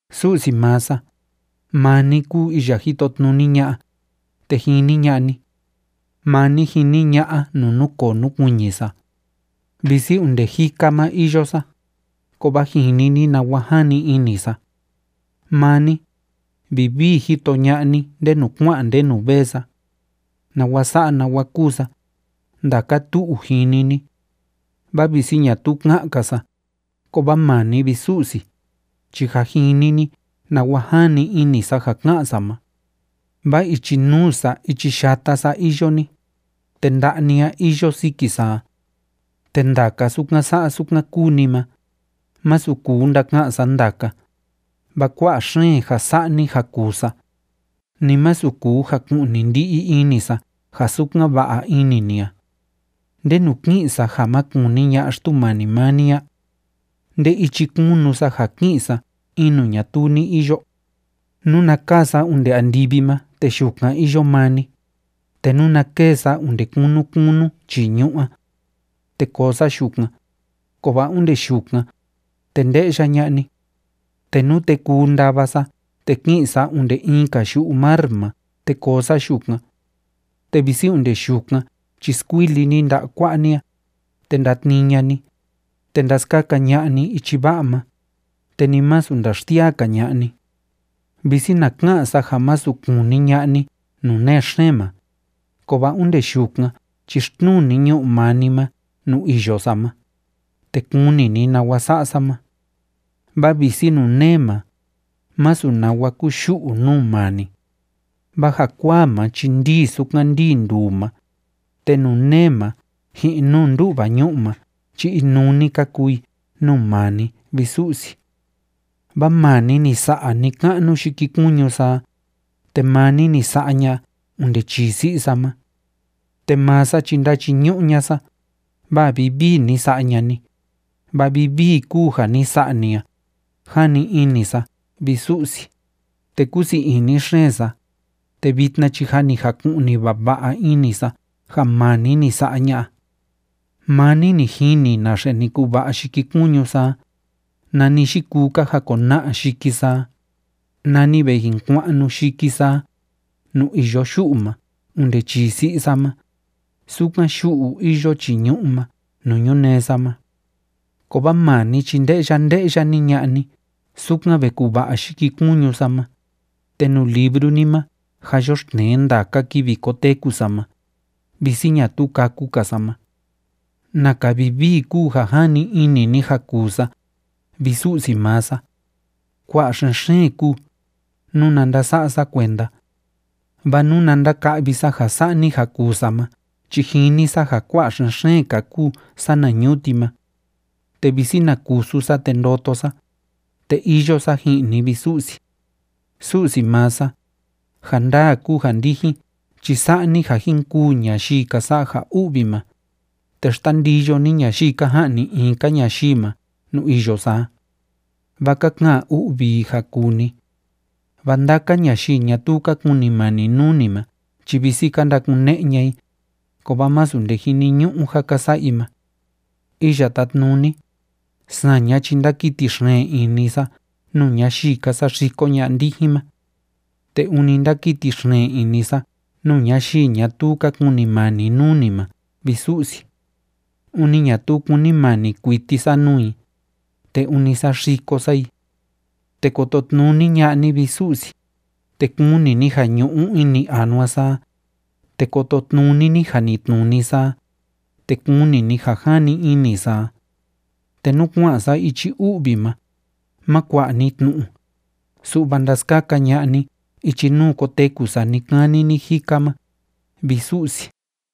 Su'si maa sa, maa ni kúu iya jitotnuni ña'a, te jini ña'a ni. Maa ni jini ña'a nuu núkoo núkuiñi sa. Visi onde jika ma iyo sa, kovaa jini ni nawa jani ini sa. Maa ni, vivii jito ña'a ni ndenu kua'an ndenu vee sa. Nawa sa'a nawa kúu sa, ndaka tu'u jini ni. Vaa visi ñatuu ka'an‑ka sa, kovaa maa ni, vi Su'si, chi jâ jini ni nawa jani ini sa ja ka'an sa ma. Vaa ichi nuu sa ichi yata sa iyo ni, te nda'a ni a iyo siki sa a. Te ndaka sukan sa'a sukan kúu ni ma, masu kuu ndaka'an sa ndaka, vaa kua'a xeen ja sa'a ni ja kuu sa, ni masu kuu jaku'ni ndi'i ini sa ja sukan va'a ini ni a. ¿Ndenu ki'in sa ja ma kuni ña'a Xtumani maa ni a? ¿Nde ichi kunu sa, ja ki'in sa in nuu ñatuu ni iyo? Nuna kaa sa onde andivi ma, te yukan iyo maa ni, te nuna kêe sa onde kunu kunu chii ñu'ú a, te koo sa yukan, kovaa onde yukan, te nde'ya ña'a ni. Te nute kuu ndava sa te ki'in sa onde in‑ka yu'u mar ma te koo sa yukan, te visi onde yukan chi skuili ni nda'a kua'a ni a, te ndatnii ña'a ni, te ndaskaka ña'a ni ichi va'a ma, te ni masu ndaxsiaa‑ka ña'a ni. Visi na ka'an sa ja masu kuni ña'a ni nuu nee xeen ma, kovaa onde yukan chi xtnuu ni ñu'u maa ni ma nuu iyo sa ma, te kuni ni nawa sa'a sa ma. Vaa visi nuu nee ma, masu nawa kuyu'u nuu maa ni. Vaa jakuaa ma chi ndii sukan ndii nduu ma, te nuu nee ma ji'in nuu ndu'va ñu'u ma chi inuu‑ni ka kuu i nuu maa ni, vi Su'si. Vaa maa ni ni sa'a ni‑ka'nu yikikuñu sa a, te maa ni ni sa'a ña'a onde chii si'i sa ma. Te maa sa chi ndachiñu'u ña'a sa, vaa vivii ni sa'a ña'a ni, vaa vivii kúu ja ni sa'a ni a, jani ini sa, vi Su'si, te kúu sii ini xeen sa, te vitna chi jâ ni jaku'ni vava'a ini sa ja maa ni ni sa'a ña'a. Maa ni ni jini naxe ni kuva'a yikikuñu sa a, nani yikuu ka jakona'a yiki sa a, nani ve jin kua'nu yiki sa a nuu iyo yu'u ma onde chii si'i sa ma, sukan yu'u iyo chii ñu'ú ma nuu ñunee sa ma. Kovaa maa ni chi nde'ya nde'ya‑ni ña'a ni sukan ve kuva'a yikikuñu sa ma, te nuu libru ni ma jâ yoxtnee ndaka kivi koteku sa ma, visi ñatuu kâku‑ka sa ma. ¡Naka vivii kúu ja jani ini ni ja kuu sa, vi Su'si maa sa! Kua'a xen‑xeen kúu, nuna ndasa'a sa kuenda. Vaa nuna ndaka'vi sa ja sa'a ni ja kuu sa ma chi jini sa ja kua'a xeen‑ka kúu sana ñuti ma. Te visi na kusu sa te ndoto sa, te iyo sa ji'in ni, vi Su'si. Su'si maa sa, ja ndaa kúu ja ndijin chi sa'a ni ja jin kûu ñayii ka sa'a ja u'vi ma, te xtandiyo ni ñayii ka ja'ni in‑ka ñayii ma nuu iyo sa a. Vaa ka ka'an u'vi i ja kuu ni. Vaa ndaka ñayii ñatuu ka kunimani nuu ni ma chi visi ka ndakune'e ña'a i, kovaa masu nde jiniñu'u ja ka sa'a i ma. Iya Tátnuni, saña chi ndákiti xeen ini sa nuu ñayii ka saxiko ña'a ndijin ma. Te ûni ndákiti xeen ini sa nuu ñayii ñatuu ka kunimani nuu ni ma, vi Su'si. Ûni ñatuu kúnimani kuiti sa nuu i, te ûni saxiko sa i. Te kototnuni ña'a ni, vi Su'si, te kuni ni ja ñu'u ini anua sa a, te kototnuni ni janitnuni sa a, te kuni ni ja jani ini sa a. Te nú kua'an sa ichi u'vi ma, má kua'a ni tnu'u, su'va ndaskaka ña'a ni ichi nuu koteku sa ni‑kani ni‑jika ma, vi Su'si.